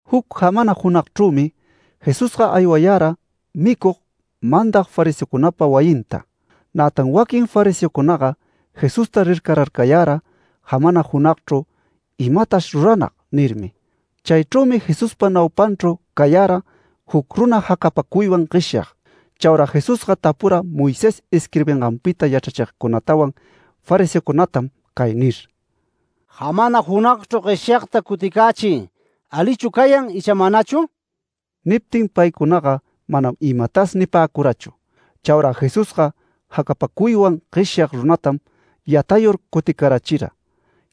Juc jamana junagchrümi, Jesusga aywara micug, mandag fariseocunapa wayinta. Nätan waquin fariseocunaga Jesusta rircararcayara jamana junagchru “Imatash ruranag” nirmi. Chaychrümi Jesuspa naupanchru cayara juc runa jacapacuywan gueshyag. Chaura Jesusga tapura Moisés isquirbinganpita yachrachigcunatawan fariseocunatam cay nir: “Jamana junagchru gueshyagta cuticächiy ¿alichu cayan, icha manachu?” Niptin paycunaga manam imatas nipäcurachu. Chaura Jesusga jacapacuywan gueshyag runatam, yatayur cuticarachira.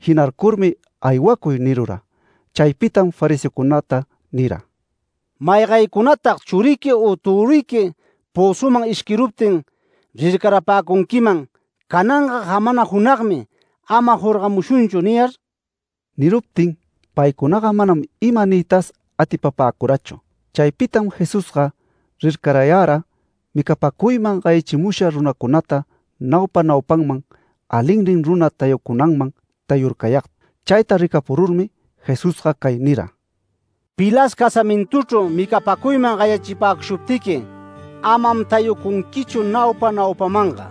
Jinarcurmi “Aywacuy” nirura. Chaypitam fariseocunata nira: “¿Maygaycunatag churiqui u töruyqui pözuman ishquiruptin rircarapäcunquiman, cananga jamana junagmi ‘Ama jorgamushunchu’ niyar?” Niruptin, paycunaga manam ima niytas atipapäcurachu. Chaypitam Jesusga rircarayara micapäcuyman gayachimusha runacunata naupa naupaman alinnin runa tayucunanman tayurcayagta. Chayta ricapururmi Jesusga cay nira: “Pilas casamintuchru micapäcuyman gayachipäshuptiqui, amam tayucunquichu naupa naupamanga.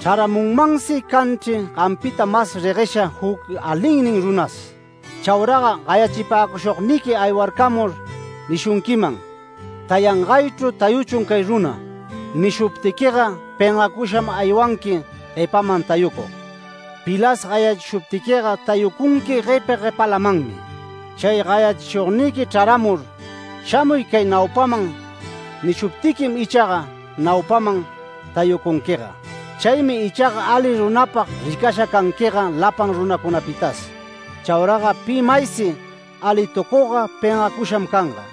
Chraramunmansi canchri gampita mas reguesha juc alinnin runas. Chauraga gayachipäcushugniqui ‘Aywarcamur’ nishunquiman, ‘Tayangaychru tayächun cay runa’. Nishuptiquiga, pengacusham aywanqui guepaman tayucug. Pilas gayachishuptiquiga, tayucunqui guepa guepalamanmi, chay gayachishugniqui chraramur, ‘Shamuy cay naupaman’ nishuptiquim ichaga ‘Naupaman tayucunquiga’. Chaymi ichaga ali runapag ricasha canquiga lapan runacunapitas. Chauraga pi maysi alitucugga pengacusham canga.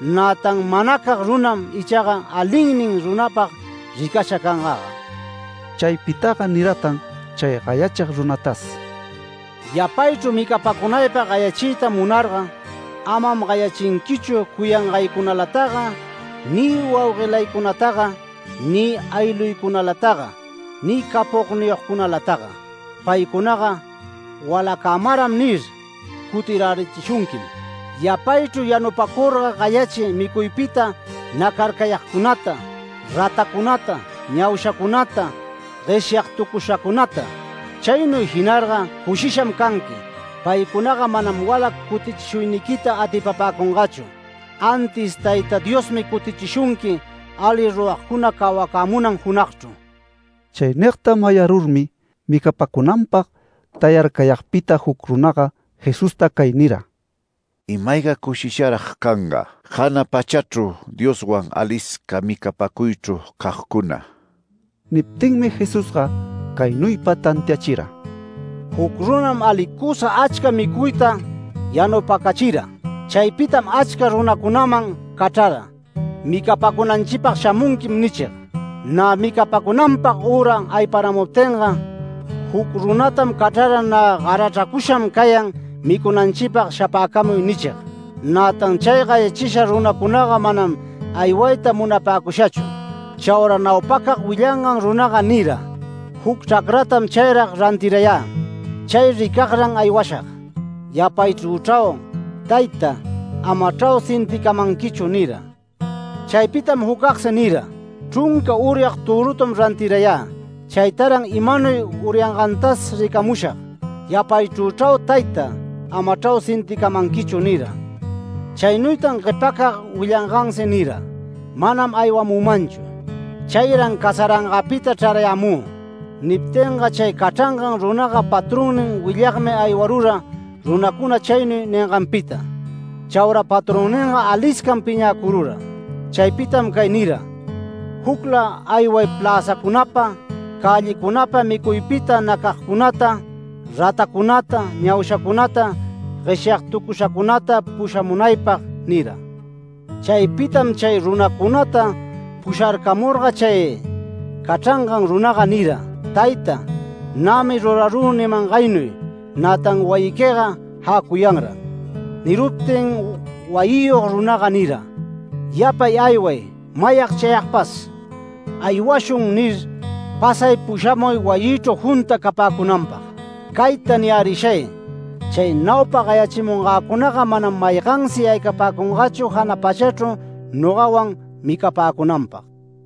Nätan manacag runam ichaga alinnin runapag ricasha cangaga”. Chaypitaga niratan chay gayachig runatas: “Yapaychru micapacunaypag gayachiyta munarga, amam gayachinquichu cuyangaycunalataga ni wauguelaycunataga ni aylluycunalataga ni capogniyogcunalataga. ‘Paycunaga walacämaram’ nir cutirärishunquim. Yapaychru yanupacurga gayachiy micuypita nacarcayagcunata, ratacunata, ñaushacunata, gueshyagtucushacunata. Chaynuy jinarga cushisham canqui. Paycunaga manam walac cutichishuyniquita atipapäcungachu, antis Tayta Diosmi cutichishunqui ali ruragcuna cawacämunan junagchru”. Chay nigta mayarurmi micapäcunanpag tayarcayagpita juc runaga Jesusta cay nira: “¡Ima-ayga cushisharag canga jana pachachru Dioswan alisca micapäcuychru cagcuna!” Niptinmi Jesusga caynuypa tantiachira: “Juc runam alicusa achca micuyta yanupacachira. Chaypitam achca runacunaman cachrara ‘Micapacunanchipag shamunquim’ nichig. Nä micapacunanpag üra ayparamuptinga, juc runantam cachrara ‘Nä garachracusham cayan micunanchipag shapäcamuy’ nichig. Nätan chay gayachisha runacunaga manam aywayta munapäcushachu. Chaura naupacag willangan runaga nira: ‘Juc chracratam chayrag rantirayä. Chay ricagran aywashag. Yapaychrüchrau, tayta. Amachrau sinticamanquichu’ nira. Chaypitam jucagsi nira: ‘Chrunca uryag törutam rantirayä. Chaytaran imanuy uryangantas ricamushag. Yapaychrüchrau tayta. Amachrau sinticamanquichu’ nira. Chaynuytan guepacag willangansi nira: ‘Manam aywamümanchu. Chayran casarangäpita chrarayämü’. Niptinga chay cachran runaga patronnin willagmi aywarura runacuna chaynuy ninganpita. Chaura patronninga aliscam piñäcurura. Chaypitam cay nira: ‘Jucla ayway pläzacunapa, cällicunapa, micuypita nacagcunata, ratacunata, ñaushacunata, gueshyagtucushacunata pushamunaypag’ nira. Chaypitam chay runacunata pusharcamurga chay cachrangan runaga nira: ‘Tayta, nämi rurarü nimangaynuy, nätan wayiquiga jäcuyanran’. Niruptin wayiyog runaga nira: ‘Yapay ayway mayag chayagpas “Aywashun” nir, pasay pushamuy wayïchru junta capäcunanpag’. Cayta niyärishay: Chay naupa gayachimungäcunaga manam maygansi yaycapäcungachu jana pachachru nogawan micapäcunanpag”.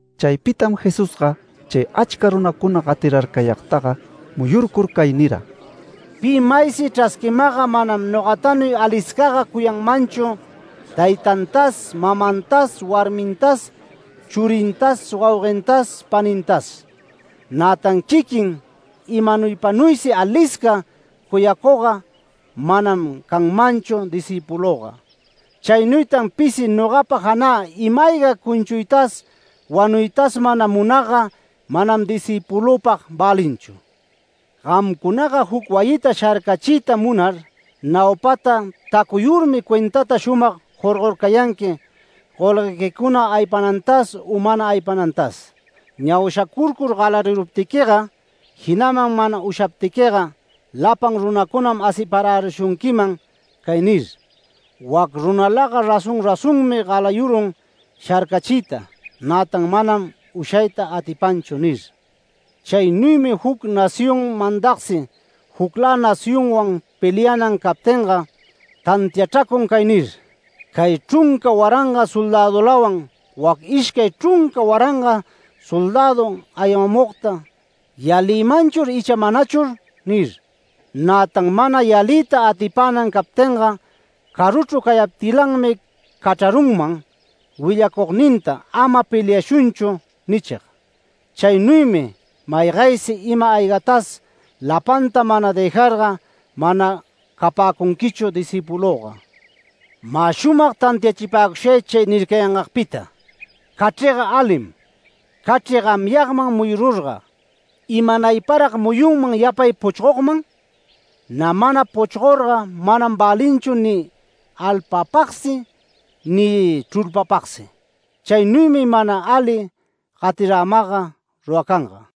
Chaypitam Jesusga chay achca runacuna gatirarcayagtaga muyurcur, cay nira: “Pi maysi chrasquimagga manam nogatanuy aliscaga cuyanmanchu taytantas mamantas warmintas churintas wauguentas panintas. Nätan quiquin imanuypanuysi alisca cuyacugga manam canmanchu discïpulüga. Chaynuytan pisi nogapa janä ima-ayga cuchuytas wanuytas mana munagga manam discïpulüpag välinchu. Gamcunaga juc wayita sharcachiyta munar, naupataga tacuyurmi cuentata shumag jorgorcayanqui golguequicuna aypanantas u mana aypanantas. Ñaushacurcur galariruptiquiga, jinaman mana ushaptiquiga lapan runacunam asiparärishunquiman cay nir: ‘Wac runalaga razón razonmi galayurun sharcachiyta. Nätan manam ushayta atipanchu’ nir. Chaynuymi juc nación mandagsi juclä nacionwan peleanan captinga, tantiachracun cay nir: ‘Cay chrunca waranga soldädulawan wac ishcay chrunca waranga soldädu aywamugta ¿yalimunchur ichaga manachur?’ nir. Nätan mana yaliyta atipänan captinga, caruchru cayaptilanmi cachrarunman willacugninta ‘Ama peliashunchu’ nichig. Chaynuymi maygaysi ima-aygatas lapanta mana dëjarga mana capäcunquichu discïpulüga. Mä shumag tantiapäcushay chay nircayangagpita: Cachriga alim. Cachri gamyagman muyurga, ¿imanayparag muyunman yapay puchgogman? Nä mana puchgorga, manam välinchu ni alpapagsi ni chrulpapagsi. Chaynuymi mana ali gatiramagga ruracanga”.